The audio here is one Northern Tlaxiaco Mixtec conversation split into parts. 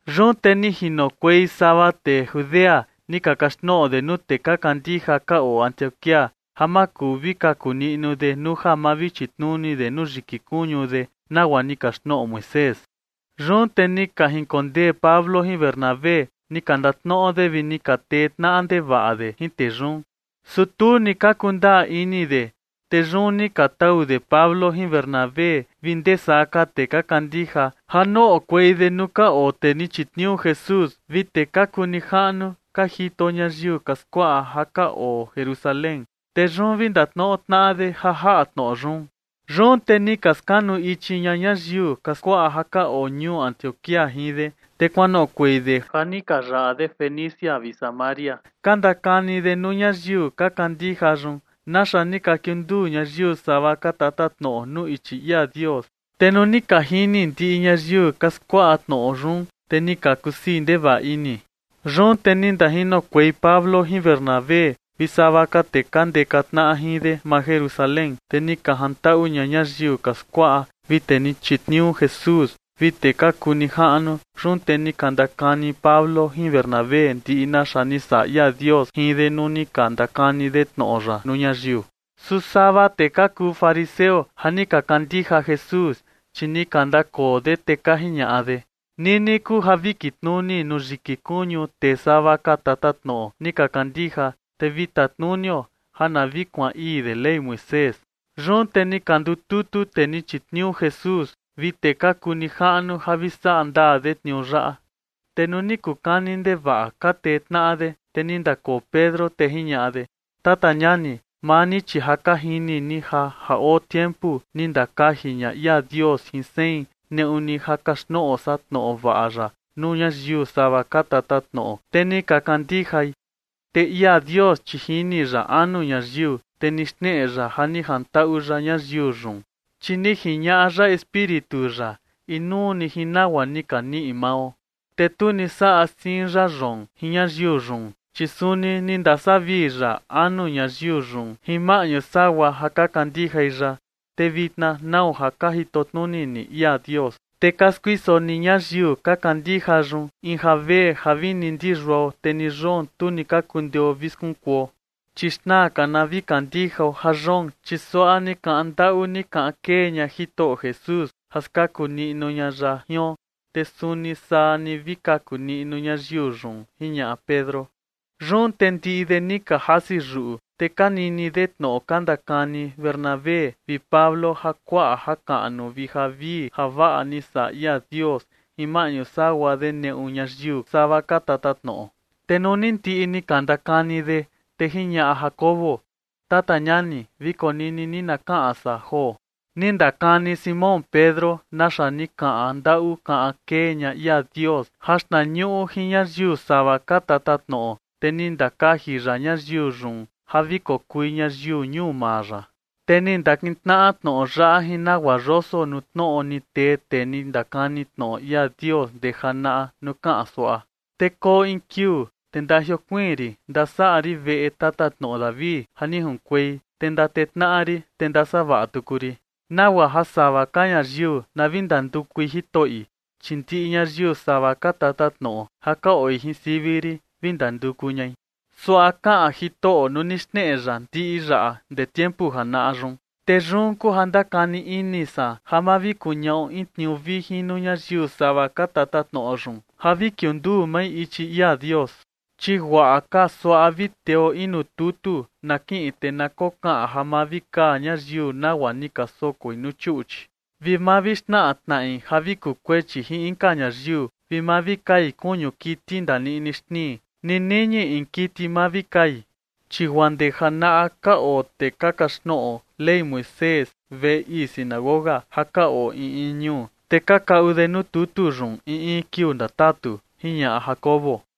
Yun te ni jinokuei sava tee Judea ni ka kaxtnoꞌo de nuu tee ka kandija ka oo Antioquía ja ma kuu vi kaku niꞌnu de nuu ja ma vi chitnuni de nuu yiki kuñu de, nagua ni kaxtnoꞌo Moisés. Yun te ni ka jinkondee Pablo jin Bernabé ni ka ndatnoꞌo de vi ni ka tee tnaꞌa ndevaꞌa de jin tee yun. Su tu ni ka kundaa ini de. Te yun ni ka tau de Pablo jin Bernabé vi ndee saa ka tee ka kandija ja noꞌokuei de nuu ka oo tee ni chitniuu Jesús vi tee ka kuu nijaꞌnu ka jito ñayiu ka skuaꞌa ja ka oo Jerusalén, te yun vi ndatnoꞌo tnaꞌa de ja jaꞌa tnoꞌo yun. Yun te ni ka skanu ichi ña ñayiu ka skuaꞌa ja ka oo ñuu Antioquía jin de, te kuanoꞌokuei de ja ni ka yaꞌa de Fenicia vi Samaria, ka ndakani de nuu ñayiu ka kandija yun naxa ni ka kiunduu ñayiu sava ka tatatnoꞌo nuu ichi ia Dios. Te nuu ni ka jini ndiꞌi ñayiu ka skuaꞌa tnoꞌo yun, te ni ka kusii ndevaꞌa ini. Yun te ni ndajinokuei Pablo jin Bernabé vi sava ka tee ka ndeka tnaꞌa jin de maa Jerusalén, te ni ka jantaꞌu ña ñayiu ka skuaꞌa vi tee ni chitniuu Jesús vi tee ka kuu nijaꞌnu. Yun te ni ka ndakani Pablo jin Bernabé ndiꞌi naxa ni saꞌa ia Dios jin de nuu ni ka ndakani de tnoꞌo ya nuu ñayiu. Su sava tee ka kuu fariseo ja ni ka kandija Jesús, chi ni ka ndakoo de, te ka jiñaꞌa de: ―Nini kuu ja vi kitnuni nuu yiki kuñu tee sava ka tatatnoꞌo ni ka kandija, te vi tatnunio ja na vi kuaan ii de Ley Moisés. Yun te ni ka ndututu tee ni chitniuu Jesús vi tee ka kuu nijaꞌnu ja vi saꞌa ndaa de tniuu yaꞌa. Te nuu ni kuu kani ndevaꞌa ka tee tnaꞌa de, te ni ndakoo Pedro, te jiñaꞌa de: ―Tata ñani, maa ni chi ja ka jini ni ja ja oo tiempu ni ndakaji ña ia Dios jin sein neꞌu ni ja kaxtnoꞌo san tnoꞌo vaꞌa ya nuu ñayiu sava ka tatatnoꞌo, te ni ka kandijai. Te ia Dios, chi jini ya anu ñayiu, te ni xneꞌe ya ja ni jantaꞌu ya ñayiu yun, chi ni jiñaꞌa ya Espíritu ya inuu ni jin nagua ni ka niꞌi mao. Te tu ni saꞌa siin ya yoon jin ñayiu yun, chi suni ni ndasavii ya anu ñayiu yun jin maꞌñu sagua ja ka kandijai ya. Te vitna, ¿nau ja ka jito tnuni ni ia Dios, te ka skuiso ni ñayiu ka kandija yun in javee ja vini ndi yuao, te ni yoon, tu ni ka kundeo vi skunkuo? Chi xnaa ka na vi kandijao ja yoon, chi suaꞌa ni kaꞌan ndaꞌu ni kaꞌan kee ña Jitoꞌo Jesús ja skaku niꞌnu ña ya jion, te suni saa ni vi kaku niꞌnu ñayiu yun ―jiñaꞌa Pedro. Yun te ndiꞌi de ni ka jasi yuꞌu, te ka nini de tnoꞌo ka ndakani Bernabé vi Pablo ja kuaꞌa jakaꞌnu vi javii javaꞌa ni saꞌa ia Dios jin maꞌñu sagua de neꞌu ñayiu sava ka tatatnoꞌo. Te nuu ni ndiꞌi ni ka ndakani de, te jiñaꞌa Jacobo: ―Tata ñani, vi konini ni na kaꞌan san joo. Ni ndakani Simón Pedro naxa ni kaꞌan ndaꞌu kaꞌan kee ña ia Dios jaxtnañuꞌu jin ñayiu sava ka tatatnoꞌo, te ni ndakaji ya ñayiu yun ja vi kokui ñayiu ñuu maa ya. Te ni ndakintnaꞌa tnoꞌo yaꞌa jin nagua yoso nuu tnoꞌo ni tee tee ni ndakani tnoꞌo ia Dios ndee janaꞌa nuu kaꞌan suaꞌa: Te koo in kiuu, te ndajiokuiin rin ndasaꞌa rin veꞌe tatatnoꞌo David ja ni junkuei, te ndatee tnaꞌa rin, te ndasavaꞌa tuku rin, nagua ja sava ka ñayiu na vi ndandukui Jitoꞌi, chi ndiꞌi ñayiu sava ka tatatnoꞌo ja ka oo jin sivi rin vi ndanduku ñai. Suaꞌa kaꞌan Jitoꞌo nuu ni xneꞌe ya ndiꞌi yaꞌa ndee tiempu janaꞌa yun. ’Te yun kuu ja ndakani ini san ja ma vi kuñaꞌo in tniuu vijin nuu ñayiu sava ka tatatnoꞌo yun ja vi kiunduu mai ichi ia Dios. Chi guaꞌa ka suaꞌa vi teo in nuu tutu na kiꞌin, te na kokaꞌan ja ma vi kaa ñayiu nagua ni ka sokoi nuu chuꞌchi, vi ma vi xnaꞌa tnaꞌi ja vi kuu kuechi jin inka ñayiu, vi ma vi kai kuñu kiti ni ndaniꞌni xnii, ni niñi in kiti ma vi kai. Chi guaa ndee janaꞌa ka oo tee ka kaxtnoꞌo Ley Moisés veꞌe ii sinagoga ja ka oo in in ñuu, te ka kaꞌu de nuu tutu yun in in kiuu ndatatu ―jiñaꞌa Jacobo.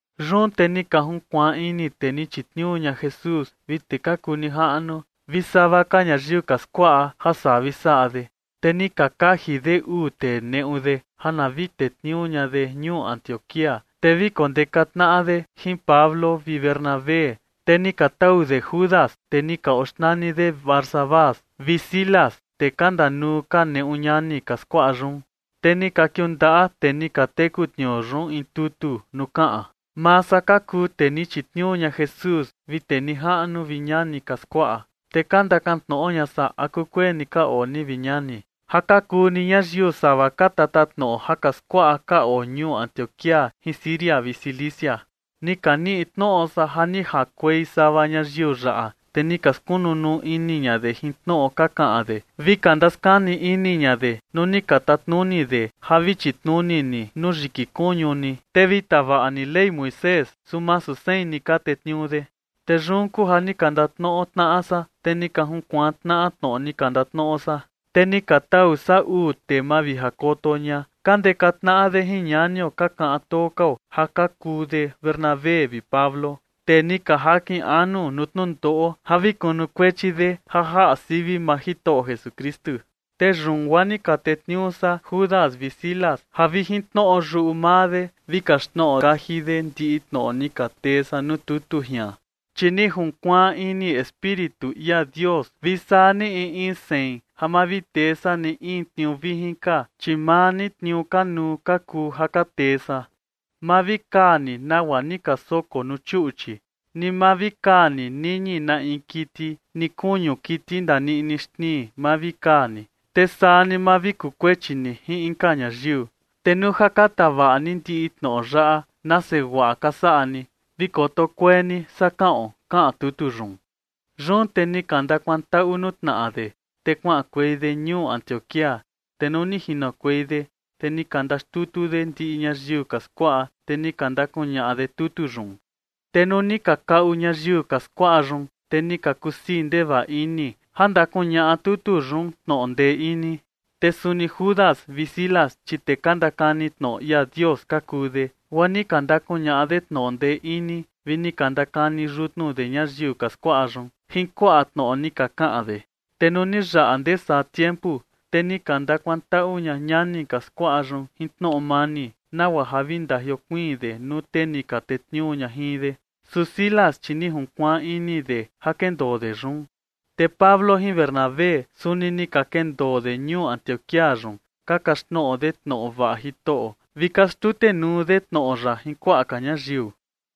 Yun te ni ka junkuaan ini tee ni chitniuu ña Jesús vi tee ka kuu nijaꞌnu vi sava ka ñayiu ka skuaꞌa ja saa vi saꞌa de. Te ni ka kaji de uu tee neꞌu de ja na vi tetniuu ña de ñuu Antioquía, te vi kondeka tnaꞌa de jin Pablo vi Bernabé. Te ni ka tau de Judas, tee ni ka oxnani de Barsabás, vi Silas, tee ka ndanuu ka neꞌu ñani ka skuaꞌa yun. Te ni ka kiundaꞌa tee ni ka teku tniuu yun in tutu nuu kaꞌan: “Maa san ka kuu tee ni chitniuu ña Jesús vi tee nijaꞌnu vi ñani ka skuaꞌa, te ka ndakan tnoꞌo ña san a kukueni ka oo ni, vi ñani, ja ka kuu ni ñayiu sava ka tatatnoꞌo ja ka skuaꞌa ka oo ñuu Antioquía jin Siria vi Cilicia. Ni ka niꞌi tnoꞌo san ja ni jakuei sava ñayiu yaꞌa, te ni ka skunu nuu ini ña de jin tnoꞌo ka kaꞌan de vi ka ndaskani ini ña de nuu ni ka tatnuni de ja vi chitnuni ni nuu yiki kuñu ni, te vi tavaꞌa ni Ley Moisés, su masu sein ni ka tetniuu de. Te yun kuu ja ni ka ndatnoꞌo tnaꞌa san, te ni ka junkuaan tnaꞌa tnoꞌo ni ka ndatnoꞌo san. Te ni ka tau san uu tee mavijakoto ña ka ndeka tnaꞌa de jin ñanio ka kaꞌan too kao ja ka kuu de Bernabé vi Pablo, tee ni ka jakin anu nuu tnundoꞌo ja vi kunukuechi de ja jaꞌa sivi maa Jitoꞌo Jesukristu. Te yun guaa ni ka tetniuu san Judas vi Silas ja vi jin tnoꞌo yuꞌu maa de vi kaxtnoꞌo kaji de ndiꞌi tnoꞌo ni ka tee san nuu tutu jian. Chi ni junkuaan ini Espíritu ia Dios vi saa ni in in sein ja ma vi tee san ni in tniuu vijin ka, chi maa ni tniuu kanuu ka kuu ja ka tee san: Ma vi kaa ni nagua ni ka soko nuu chuꞌchi, ni ma vi kaa ni niñi na in kiti, ni kuñu kiti ndaniꞌni xnii ma vi kaa ni, te saa ni ma vi kuu kuechi ni jin inka ñayiu. Te nuu ja ka tavaꞌa ni ndiꞌi tnoꞌo yaꞌa, nase guaꞌa ka saꞌa ni. Vi koto kuee ni, saa kaꞌon.” Kaꞌan tutu yun. Yun te ni ka ndakuantaꞌu nuu tnaꞌa de, te kuaꞌankuei de ñuu Antioquía. Te nuu ni jinokuei de, te ni ka ndaxtutu de ndiꞌi ñayiu ka skuaꞌa, te ni ka ndakuñaꞌa de tutu yun. Te nuu ni ka kaꞌu ñayiu ka skuaꞌa yun, te ni ka kusii ndevaꞌa ini ja ndakuñaꞌa tutu yun tnoꞌo ndee ini. Te suni Judas vi Silas, chi tee ka ndakani tnoꞌo ia Dios ka kuu de, guaa ni ka ndakuñaꞌa de tnoꞌo ndee ini, vi ni ka ndakani yutnu de ñayiu ka skuaꞌa yun jin kuaꞌa tnoꞌo ni ka kaꞌan de. Te nuu ni yaꞌa ndee saa tiempu, te ni ka ndakuantaꞌu ña ñani ka skuaꞌa yun jin tnoꞌo mani, nagua ja vi ndajiokuiin de nuu tee ni ka tetniuu ña jin de. Su Silas, chi ni junkuaan ini de ja kendoo de yun. Te Pablo jin Bernabé, suni ni ka kendoo de ñuu Antioquía yun, ka kaxtnoꞌo de tnoꞌo vaꞌa Jitoꞌo, vi ka xtutenuu de tnoꞌo ya jin kuaꞌa ka ñayiu.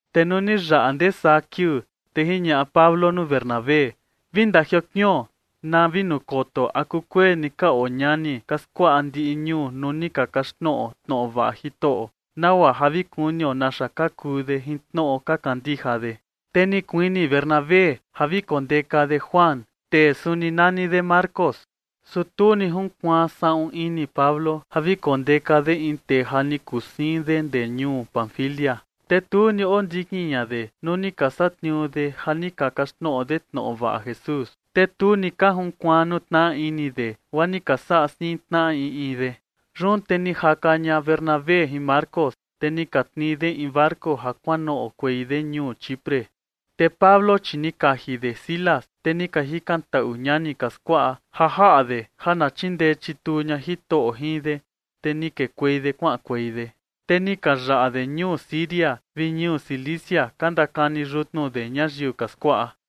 Te nuu ni yaꞌa ndee saa kiuu, te jiñaꞌa Pablo nuu Bernabé: ―Vi ndajiokuion na vi nukoto a kukueni ka oo ñani ka skuaꞌa ndiꞌi ñuu nuu ni ka kaxtnoꞌo tnoꞌo vaꞌa Jitoꞌo, nagua ja vi kunio naxa ka kuu de jin tnoꞌo ka kandija de. Te ni kuini Bernabé ja vi kondeka de Juan, tee suni nani de Marcos. Su tu ni junkuaan saꞌun ini Pablo ja vi kondeka de in tee ja ni kuu siin de ndee ñuu Panfilia, te tu ni ondikin ña de nuu ni ka satniuu de ja ni ka kaxtnoꞌo de tnoꞌo vaꞌa Jesús. Te tu ni ka junkuaan nuu tnaꞌa ini de, guaa ni ka saꞌa siin tnaꞌa in in de. Yun te ni jaka ña Bernabé jin Marcos, te ni ka tnii de in barco ja kuanoꞌokuei de ñuu Chipre. Te Pablo, chi ni kaji de Silas, te ni ka jikantaꞌu ñani ka skuaꞌa ja jaꞌa de ja na chindee chituu ña Jitoꞌo jin de, te ni kekuei de kuaꞌankuei de. Te ni ka yaꞌa de ñuu Siria vi ñuu Cilicia ka ndakani yutnu de ñayiu ka skuaꞌa.